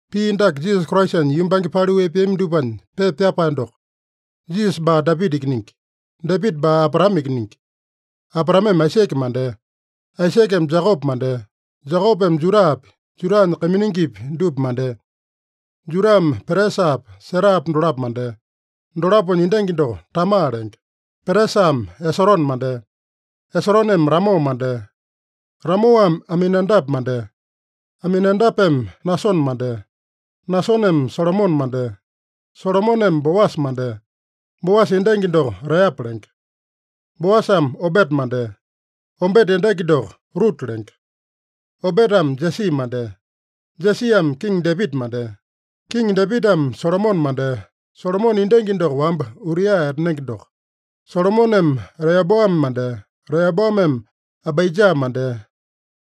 Pii dake Jisasa Kraisanya yumbange paliu epeami dupanya pepa pyapae doko. Jisasa baa Dapita ikiningi. Dapita baa Abraame ikiningi. Abraameme Aisake mandea. Aisakeme Jekope mandea. Jekopeme Judapi, Judanya kaiminingipi dupa mandea. Judame Peresapa, Serapa dolapo mandea. Dolaponya endangi doko Tama lenge. Peresame Esorone mandea. Esoroneme Ramo mandea. Ramoame Aminadape mandea. Aminadapeme Nasone mandea. Nasoneme Salomone mandea. Salomoneme Boasa mandea. Boasa endangi doko Reapa lenge. Boasame Obeta mandea. Obeta endangi doko Ruta lenge. Obetame Jesi mandea. Jesiame Kiŋi Dapita mandea. Kiŋi Dapitame Solomone mandea. Solomone endangi doko wamba Uria etanenge doko. Solomoneme Reoboame mandea. Reoboameme Abaija mandea.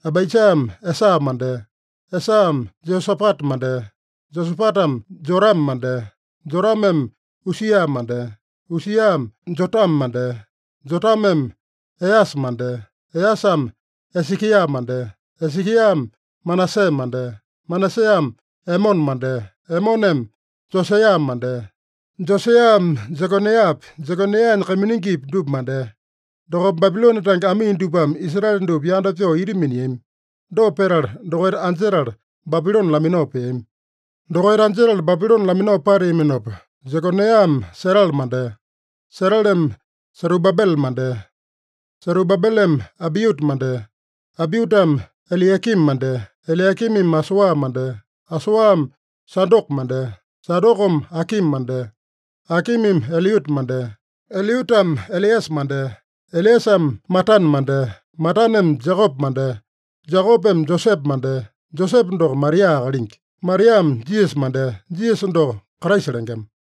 Abaijame Esa mandea. Esame Jeosapata mandea. Jeosapatame Jorame mandea. Jorameme Usia mandea. Usiame Jotame mandea. Jotameme Easa mandea. Easame Esekia mandea. Esekiame Manase mandea. Manaseame Emone mandea. Emoneme Josaeya mandea. Josaeyame Jekonaeyapi, Jekonaeyanya kaiminingipi dupa mandea. Dokopa Babilone tange amii dupame Israele dupa yanda pyoo ita miniami. Dopa petala, dokaita anjetala Babilone laminao peami. Dokaita anjetala Babilone laminao pateaminopa, Jekonaeyame Setele mandea. Seteleme Serubabele mandea. Serubabeleme Abiuta mandea. Abiutame Eliakimi mandea. Eliakimimi Asoa mandea. Asoame Sadoko mandea. Sadokome Akimi mandea. Akimimi Eliuta mandea. Eliutame Eleasa mandea. Eleasame Matane mandea. Mataneme Jekope mandea. Jekopeme Josepe mandea. Josepe doko Maria akalingi. Mariame Jisasa mandea. Jisasa doko Kraisa lengema.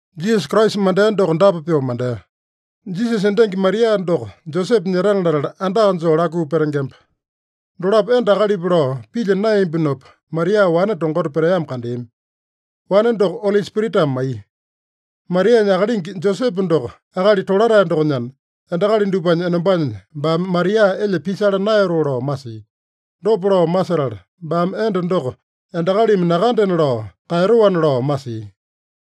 Jisasa Kraisa mandea doko dapa pyoo mandea: Jisasa endangi Maria doko Josepe nyetana latala, andaka joo lakuu petengemba. Dolapo enda akalipa lao pilya naeyambinopa, Maria wane tongota peteamo kandeami. Wane doko Oli Spiritame maiya. Marianya akalingi Josepe doko akali tolatae dokonyana, endakali dupanya enombanya baame Maria elya pisala naeyatoo lao masia. Dopa lao masetala, baame enda doko endakalimi nakandena lao kaeyatoana lao masia.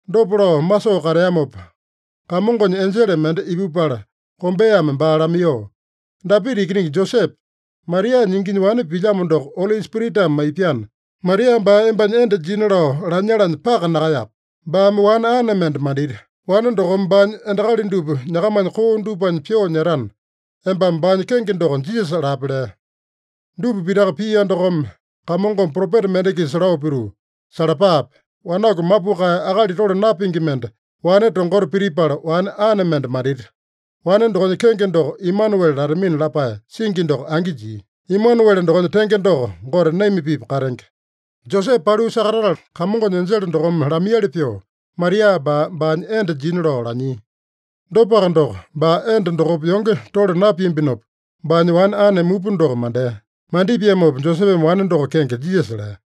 Dopa lao masoo kateamopa, Kamongonya enjele mende ipupala kombeame baa lamaiyoo, “Dapita ikiningi Josepe, Marianya inginya wane pilyamo doko Oli Spiritame maipyana, Maria baa embanya enda jina lao lanyalanya paka nakaeyape. Baame wane ane mende mandita. Wane dokome baanya endakali dupa nyakamanya koo dupanya pyoo nyetana, embame baanya kenge doko Jisasa lape” lea. Dupa pitaka pia dokome, Kamongome propeta mende-kisa lao pituu, “Salapape! Wanaku mapukae, akali tole napingi mende, wane tongota pitipala wane ane mende mandita. Wane dokonya kenge doko Emanuele latamina” lapae singi doko angi jia. (Emanuele dokonya tenge doko, Gote naima-pipa katenge.) Josepe paliu sakatatala, Kamongonya enjele dokome lamaiyali pyoo, Maria baa baanya enda jina lao lanyia. Dopaka doko, baa enda dokopa yonge tole napiambinopa, baanya wane ane mupa doko mandea. Mandipiamopa Josepeme wane doko kenge Jisasa lea.